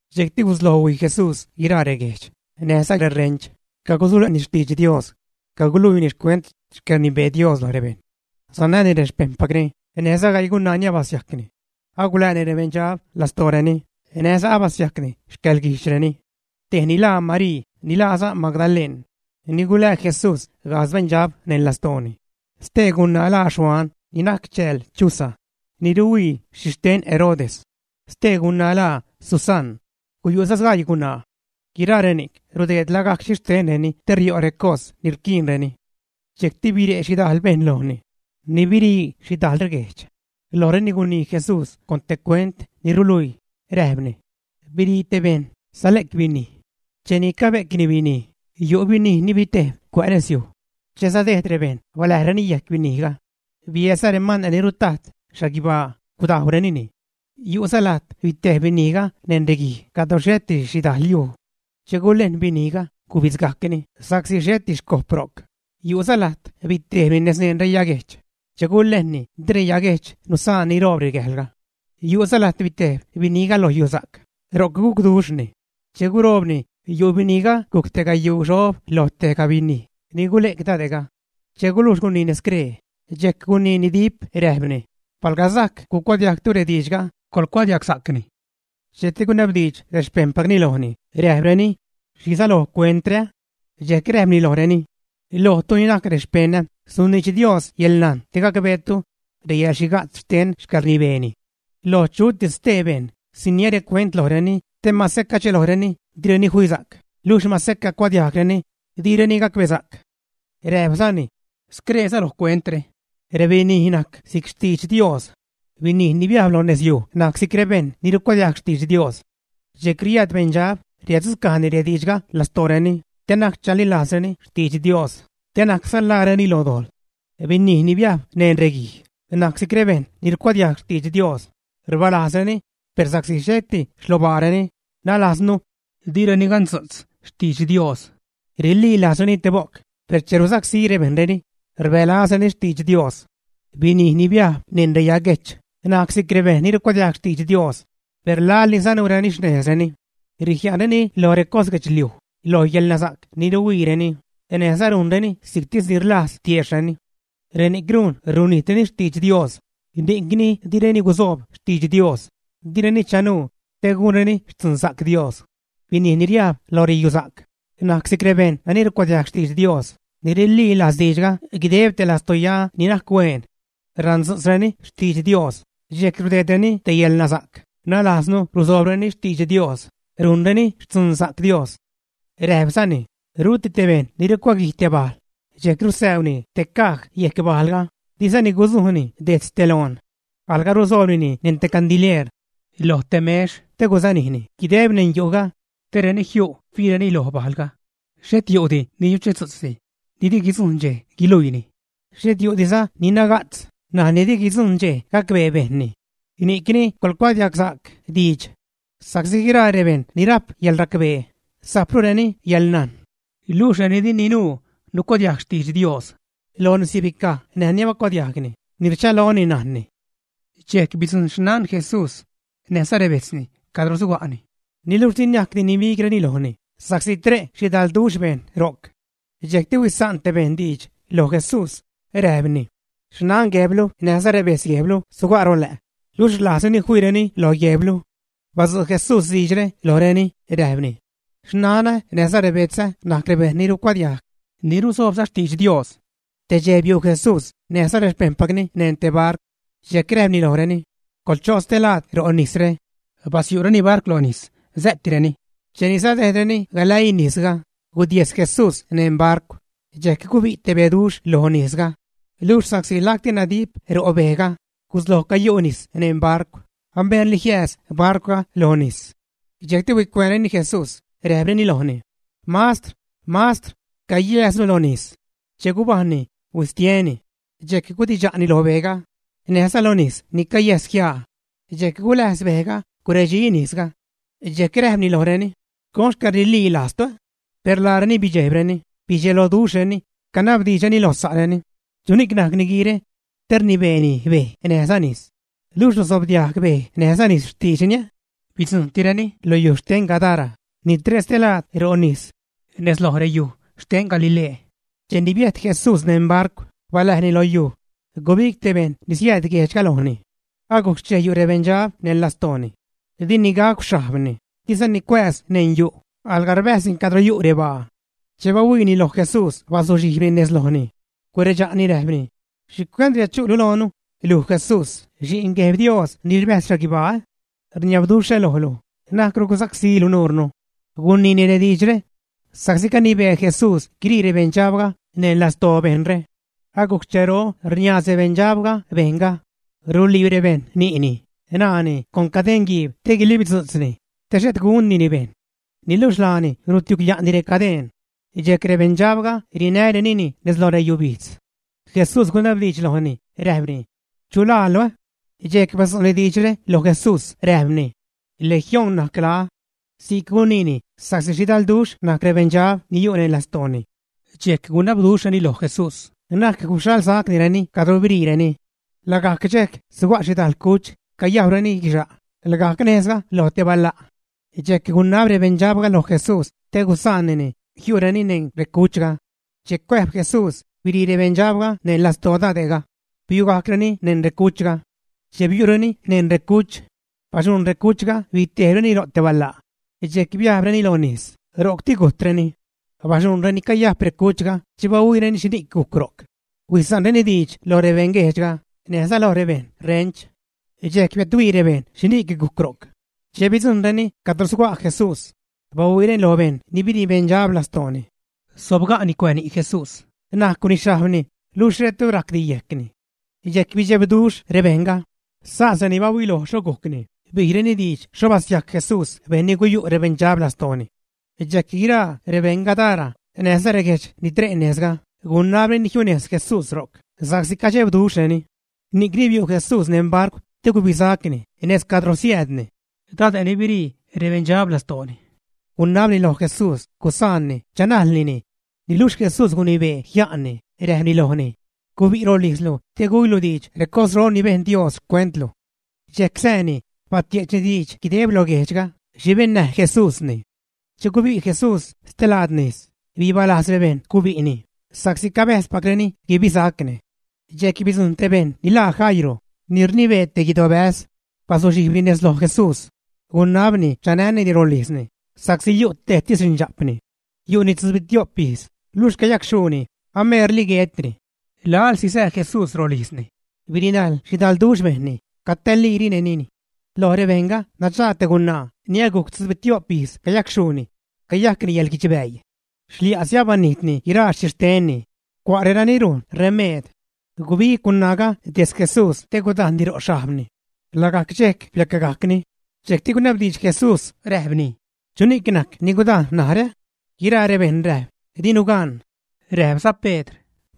Dxejcti gusloj huij Jesús guiraa reguejdx näjza rerench, cagusule'ni xtidx Dios, caguluiini xcuent xcäḻrnibee Dios loj rebejṉ. Sanäni rexpejṉpacni näjza gaii gunaa ni abasiajcni, agulääni rebeṉdxab lastooreni, näjza basiajcni xcäḻguijdxreni. Tejni laa Marii ni laaza Magdaleṉ, ni gulää Jesús gajdz beṉdxab neṉ lastooni. Stee gunaa laa Xuan, ni najc chääl Chuza, ni ruhuii xhixten Herodes. Stee gunaa laa Susaṉ. Guyu'za sgaii gunaa. Guiraa reni'c rudeed lagajc xhixtenreni te rio' recos ni rquiinreni. Dxejcti bire' xhidajl bejṉ lojni ni birii xhidajl reguejdx. Lojreni gunii Jesús con te cuent ni ruluii, räjpni: ―Birii te bejṉ sale'c binij. Cheni cabe'cni binij, yu' binij ni bitejb cuä' nezyuj. Che sadejd rebejṉ baläjreni yejc binijga, biäädza remane' ni rutajt xhaguibaa, gudajwrenini. Yu'za lajt bitejb binijga neṉ reguij cadro xheti xhidajl yuj. Che gulejn binijga, gubidzgajcni sa'csi xheti xcojp ro'c. Yu'za lajt bitejbni nez neṉ reyaguejch. Che gulejnni, di reyaguejch nusaan niroob gäjlga. Yu'za lajt bitejb binijga lo yusa'c, ro'c gucduxhni. Cheni guroobni, yu' binijga gujc te gayuu xob loj tejga binij ni gule'c dade'ga. Che gulujx guniini scree, dxejc guniini dip räjpni: ―Palga sajc gucuadiajgtu rediidxga, coḻcuadiagsa'cni. Dxejcti gunabdiidx rexpejṉpacni lojni räjpreni: ―¿Xhi säloj cuentre? Dxejc räjpni lojreni: ―Lojtu ni najc rexpejṉä suniidx Dios yäḻnajn te gacbeetu reyäḻxhiga'tz xten xcäḻrnibeeni. Loj chutis stee bejṉ, siniä recuent lojreni te mase cadxelojreni, direni fisa'c, luxh mase cacuadiajgreni, direni gacbesa'c. Räjpzani: ―Scree säloj cuentre, rebinij najc si'c xtidx Dios. Binij ni biajb lo nezyuj najc si'c rebejṉ ni rucuadiajg xtidx Dios. Dxejc riääd beṉdxab, riäddzucajni rediidxga lastooreni te na'c chalilajzreni xtidx Dios, te na'cza ḻaareni lo dojḻ. Binij ni biajb neṉ reguij najc si'c rebejṉ ni rucuadiajg xtidx Dios, rbaalajzreni; per sa'csi xheti xlobaareni, nälajznu, direni gandzu'tz xtidx Dios, rililajzreni te bo'c, per che rsacsí rebejṉreni, rbälazreni xtidx Dios. Binij ni biajb neṉ reyaguejch najc si'c rebejṉ ni rucuadiajg xtidx Dios, per laḻ ni sanuureni xnejzreni, rijia'nreni lo recos guedxliuj, lo yäḻnasa'c ni ruhuiireni, näjza rujnreni si'ctis ni rlajz tiejxhreni. Reni'c rujn runijtreni xtidx Dios, ni'cni direni guzoob xtidx Dios, direni chanuu te gunreni xtzunsa'c Dios. Binij ni riajb lo reyusa'c najc si'c rebejṉ nani rucuadiajg xtidx Dios, ni rililajz diidxga guideb te lastoya ni najc hueen. Randzu'tzreni xtidx Dios, dxejc rudeedreni te yälnasa'c, nalajznu ruzoobreni xtidx Dios, rujnreni xtzunsa'c Dios. Räjpzani: ―Ruti te bejṉ ni rucuaguij te bajl dxejc rusäuni te caj yejc bajlga, dizani gusujnini dejtz te loon. Alga rusoobnini neṉ candilieer loj te mex te guzanijni guideb neṉ yu'ga te reni jiu' fiireni lo bajlga. Xhet yu'di ni yuchetzu'tzdi ni di guidzujṉ dxej guiluiini; xhet yu'diza ni naga'tz ṉaj ni di guidzujṉ dxej gacbee bejṉni. ’Ni'cni coḻcuadiagsa'c diidx; sa'csi guiraa rebejṉ ni rajp yäḻracbee, sajprureni yäḻnajn. Luxh reni di ninuu nucuadiajg xtidx Dios, lojni sibicaj näj ni abacuadiajgni, ni rchaloni najnni. Dxejc bidzujṉ xnan Jesús näjza rebejtzni cadro suga'ni, niluxh di niajcdi nibigreni lojni sa'csi tre' xhidalduxh bejṉ ro'c. Dxejcti huisa'n te bejṉ diidx loj Jesús, räjpni: ―Xnan guejblu näjza rebejtz guejblu suga' rolä', luxh rlajzreni fiireni lo guejblu. Badzu' Jesús diidxre lojreni, räjpni: ―Xnanä näjza rebetzä najc rebejṉ ni rucuadiajg, ni ruzoobza xtidx Dios. Te dxej biu' Jesús näjza rexpejṉpacni neṉ te barcw. Dxejc räjpni lojreni: ―Coḻcho' stelaad ro' nisre. Basyu'reni barcw lo nis, sä'tireni. Cheni sadejdreni galäii nisga, gudiejs Jesús neṉ barcw. Dxejc gubi' te beduxh lo nisga, luxh sa'csi lacti nadip ro' bejga, gusloj cayu' nis neṉ barcw, ameerli jiääz barcwga lo nis. Dxejcti huicuäänreni Jesús, räjpreni lojni: ―¡Mastr! ¡Mastr! ¡Cayääznu lo nis! Che gubajṉni, huistieni, dxejc gudidxa'ni lo bejga näjza lo nis ni cayäsjiaa. Dxejc guläjz bejga, guredxiza nisga. Dxejc räjpni lojreni: ―¿Con xcäḻrililajztu, ä? Per laareni bidxejbreni, bidxeloduxhreni, canabdiidxreni lo sa'reni: ―¿Chuni'c najc niguiire te rnibeeni bej näjza nis, luxh rusobdiajg bej näjza nis xtiidxni? Bidzujṉtireni lo yuj xten Gadara ni tre' stelaad ro' nis nez loj reyuj xten Galilee. Cheni biäjt Jesús neṉ barcw baläjni lo yuj, gubig te bejṉ ni siääd guejdxga lojni. Agujc xchej yu' rebeṉdxab neṉ lastooni. Dini gacw xhajbni, dizani cuääz neṉ yu', alga rbäjzni cadro yu' rebaa. Che bahuiini loj Jesús bazuxhijbni nez lojni, guredxa'ni räjpni: ―¿Xhicuent riädchu'lu loonu, luj, Jesús Xi'n Gueb Dios ni rbäjz xhaguibaa? Rniabduxhä lojlu, na'cru gusacsílu nuurnu. Guniini rediidxre sa'csi canibee Jesús guirii rebeṉdxabga neṉ lastoo bejṉre. Agujc xchero cazob rniaaz rebeṉdxabga bejṉga ruliib rebejṉ ni'ni, ṉaani con cadeṉguiib te guilibdzu'tzni, te xhet gundini bejṉ. Niluxh laani rutiugya'ni recadeṉ, dxejc rebeṉdxabga rinärenini nez lo reyubijdz. Jesús gunabdiidx lojni, räjpni: ―¿Chu laalu? Dxejc badzu'ni diidxre loj Jesús räjpni: ―Legión najc laä. Si'c guniini sa'csi xhidalduxh najc rebeṉdxab ni yu' neṉ lastooni. Dxejc gunabduxhreni loj Jesús na'c guxhaḻsacnireni cadro biriireni. Lagajc dxejc suga' xhidajl cuch cayajwreni guixa' lagajc nejzga lo te bala'. Dxejc gunab rebeṉdxabga loj Jesús te gusaanni jiu'reni neṉ recuchga. Che cuäjb Jesús, biṟii rebeṉdxabga neṉ lastoo dade'ga, biugajcreni neṉ recuchga. Che biu'reni neṉ recuch, baxuṉ recuchga bitejbreni ro' te bala', dxejc biajbreni lo nis, ro'cti gujtreni. Baxuṉ reni cayajp recuchga che bahuiireni xhini'c gujc ro'c, huisa'nreni diidx lo rebeṉguejdxga näjza lo rebeṉ ṟench. Dxejc biädhuii rebejṉ xhini'c gujc ro'c. Che bidzujṉreni cadro suga' Jesús, bahuiireni loj bejṉ ni biṟii beṉdxab lastooni. Sobga'ni cuä' ni' Jesús, najcwni xhajbni, luxh xhetru rajcdi yejcni; dxejc bidxebduxh rebejṉga. Sas reni bahuiloj xho gujcni, bijreni diidx xho basiajc Jesús bejṉ ni guyu' rebeṉdxabre lastooni. Dxejc guiraa rebeṉ Gadara näjza reguejdx ni tre' nejzga, gunabreni jiunejz Jesús ro'c sa'csi cadxebduxhreni. Ni'cni biu' Jesús neṉ barcw te gubisacni nejz cadro siäädni. Dade' ni biṟii rebeṉdxab lastooni gunabni lo Jesús gusaanni chanajlnini, niluxh Jesús gunibee jia'nni, räjpni lojni: ―Gubi' rolijzlu te güilu diidx recosro ni bejn Dios xcuent luj. Dxejc sääni, batie'chni diidx guideb lo guejdxga xhi bennäj Jesúsni. Che gubi' Jesús stelaad nis, bibalajz rebejṉ gubi'ni, sa'csi cabäjzpacreni guibisacni. Dxejc bidzujṉ te bejṉ ni laa Jairo, ni rnibee te guidobäz, bazuxhijbni nez loj Jesús, gunabni chanänini rolijzni sa'csi yu' tejtis xindxa'pni. Yu'ni tzubitio'p ijz, luxh cayacxhuuni, ameerli guetni. Laḻsi sää Jesús rolijzni, birinajl xhidalduxh bejṉni, catäälirenini. Loj rebejṉga nadxaag te gunaa ni agujc tzubito'p ijz cayacxhuuni, cayajcni yäḻguidxbäii. Xlia'si abanijtni guiraa xhixtenni cua' renani rujn remeed. Gubig gunaaga dejtz Jesús te gudajnni ro' xhajbni. Lagajc dxejc biacgajcni. Dxejcti gunabdiidx Jesús räjpni: ―¿Chuni'c najc ni gudajn narä, ä? Guiraa rebejṉ räjp: ―Dinu gan. Räjpza Pedr: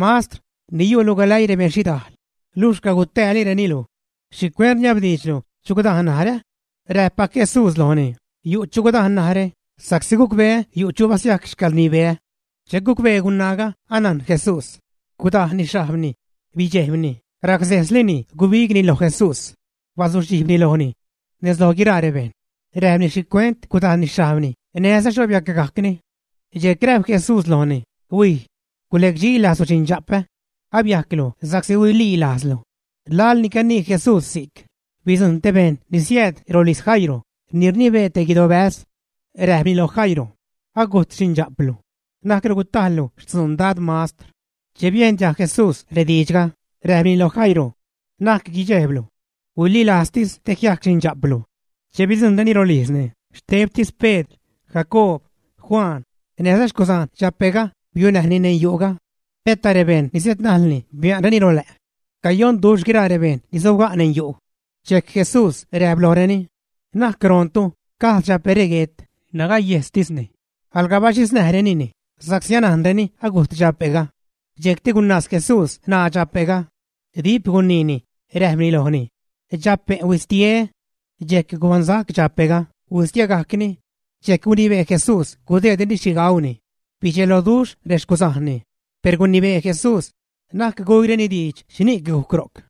―Mastr, ni yu'lu galäii rebeṉ xhidajl, luxh cagutäälireni luj. ¿Xhicuent rniabdiidxlu: “¿Chu gudajn narä?” Räjppac Jesús lojni: ―Yu' chu gudajn narä, sa'csi gucbeä yu' chu basiajc xcäḻrnibeä. Che gucbee gunaaga anajn Jesús gudajnni xhajbni, bidxejbni, racsejslini gubigni loj Jesús, bazuxhijbni lojni. nez loj guiraa rebejṉ räjpni xhicuent gudajnni xhajbni näjza xho biacgajcni. Dxejc räjp Jesús lojni: ―Huij. Gulecdxilajzlu, xinda'pä. Abiajclu sa'csi huililajzlu. Laḻni canii Jesús si'c bidzujṉ te bejṉ ni siääd rolijz Jairo, ni rnibee te guidobäz. Räjpni loj Jairo: ―Agujt xindxa'plu. Na'cru gutajllu xtzuun Dad Mastr. Che biejn diajg Jesús rediidxga, räjpni loj Jairo: ―Na'c guidxejblu. Huililajztis te jiac xindxa'plu. Che bidzujṉreni rolijzni, xtebtis Pedr, Jacoob, Juan näjza xcuzajn dxape'ga biunäjni neṉ yu'ga. Peta rebejṉ ni siädnajlni bia'nreni rolä'. Cayonduxh guiraa rebejṉ ni sobga' neṉ yu'. Dxejc Jesús räjp lojreni: ―Na'c roontu, gajd dxape're guet, nagayejstisni. Alga baxhiznäjrenini, sa'csi anajnreni agujt dxape'ga. Dxejcti gunaaz Jesús ṉaa dxape'ga, dip guniini, räjpni lojni: ―¡Dxape', huistie! Dxejc gubaṉsac dxape'ga, huistiegajcni. Dxejc gunibee Jesús gudeedreni xhi gauni. Bidxeloduxh rexcuzajnni. Per gunibee Jesús na'c güireni diidx xhini'c gujc ro'c.